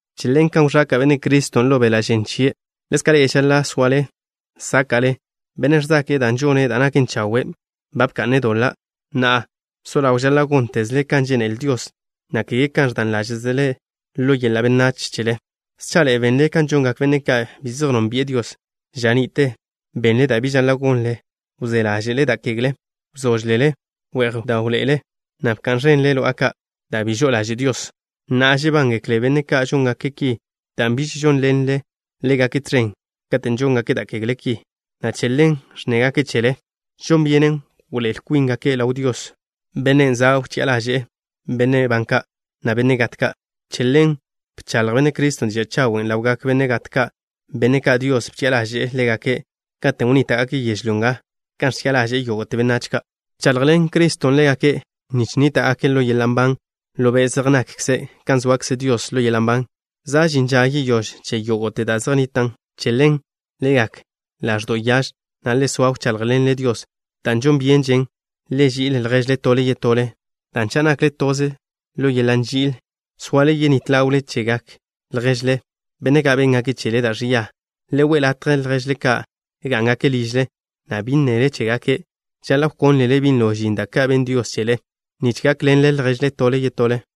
Che ḻen kan wẕaka' Benne' Criston' ḻo beḻa' žen chie', ḻezka' ḻe'e žaḻa' soale sáka'le. Bennen' ẕzake'e dan' žone' da' naken chawe' ba bka'ne' doḻa'. Na'a so ḻaw, žaḻa' góntezle kan žénele Dios, na' kege kan ẕdan ḻáže'zele ḻo yeḻa' benách chele. Schaḻe'e benle kan žongak benne' ka' bi zej nónbi'e Dios. Ža ni'te benle da' bi žaḻa' gonle. Wzé ḻáže'le da' kegle ka'. Wzóžlele. We'j bdáwḻe'ele na' bka'n ẕenle lo'a ka' da' bi žo'o ḻaže' Dios. Na'a, žebángekle benne' ka' žóngake' ki dan' biž žónḻenle ḻégake' tẕen katen' žóngake' da' kegle ki, na' che ḻen ẕnnégake' chele. Žon byenen wḻoé'el kwíngake' ḻaw Dios, Bennen' za' wchi'a ḻaže'e benne' ban ka', na' benne' gat ka'. Che ḻen bchaḻj Benne' Criston' diža' chawen' ḻawgak benne' gat ka', benne' ka' Dios bchi'a ḻaže'e ḻégake' katen' wnníta'gake' yežlyó nga, kan ẕchi'a ḻaže'e yógo'te benách ka'. Bchaḻjḻen Criston' ḻégake' nich nníta'gake' ḻo yeḻa' nban ḻo be' zej nakkze', kan zoakze Dios ḻo yeḻa' nban. Za' žin ža yeyóž che yógo'te da' zej nnitan'. Che ḻen, le gak ḻaẕdo' yaž, na' le soa wcháḻjḻenle Dios. Da' žon byenžen, le ži'il lježle tole yetole, dan' cha' nakle toze ḻo yeḻa' nži'il, soale yenít ḻawle chegak lježle, benne' ka' béngake' chele da' ẕia. Le we' latje lježle ka' gá'ngake' ližle, na' bi nnele chégake'. Žaḻa' wkónlele binlo žin da' ka' benn Dios chele, nich gákḻenle lježle tole yetole.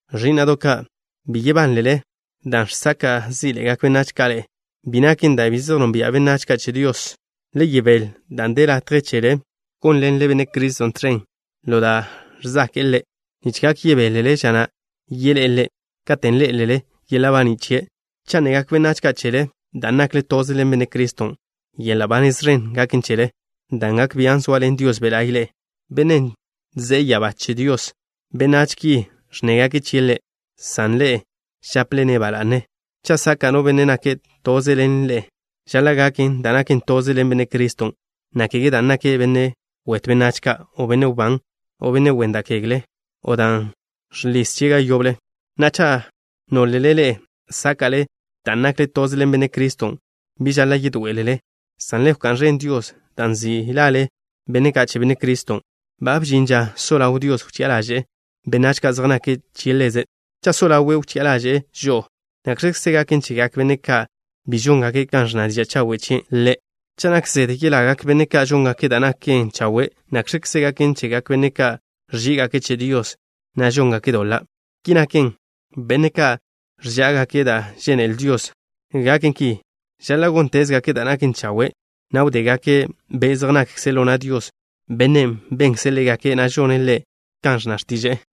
Ẕí'na'do' ka', bi yebánlele dan' žsaka' zí'ḻe'egak benách ka' ḻe'e. Bi naken da' bi zej nonbia' benách ka' che Dios. Le yebél dan' de latje chele gónḻenle Benne' Criston' tẕen ḻo da' ẕzake'e Ḻe' nich gak yebélele ža na' yeḻé'e Ḻe', katen' ḻé'elele yeḻa' baní' chie'. Cha' nnegak benách ka' chele dan' nakle toze ḻen Benne' Criston', yeḻa' ba nez ẕen gaken chele, dan' gak bian' zoaḻen Dios Be' La'y ḻe'e, Bennen' ze'e ya'abá che Dios. Benách ki ẕnnégake' chie' Ḻe', san ḻe'e žaple-ne' ba la'ne. Cha' saka' no benne' nake' toze ḻen ḻe'e, žaḻa' gaken dan' nake' toze ḻen Benne' Criston', na' kege dan' nake' benne' wetw benách ka', o benne' wbán, o benne' wen da' kegle, o dan' žliz chie' ga yoble. Na'a, cha' nólele ḻe'e sáka'le dan' nakle toze ḻen Benne' Criston', bi žaḻa' yedoé'elele, san le wká'n ẕen Dios dan' nzi' lale benne' ka' che Benne' Criston'. Ba bžin ža so ḻaw Dios wchi'a ḻaže'e benách ka' zej nake' che Ḻeze'. Cha' so ḻawe' wchi'a ḻaže'e žo'o, ¿nakx̱kze gaken chegak benne' ka' bi žóngake' kan ẕnna diža' chawen' chie' Ḻe'? Cha' nak zede yelagak benne' ka' žóngake' da' naken chawe', ¿nakx̱kze gaken chegak benne' ka' ẕží'igake' che Dios, na' žóngake' doḻa'? Ki naken, benne' ka' ẕzáka'gake' dan' žénele Dios gaken ki, žaḻa' góntezgake' da' naken chawe', na' wdégake' be' zej nakkze' ḻo na' Dios, Bennen' benkze' ḻégake', na' žone' Ḻe' kan ẕnna x̱tiže'e.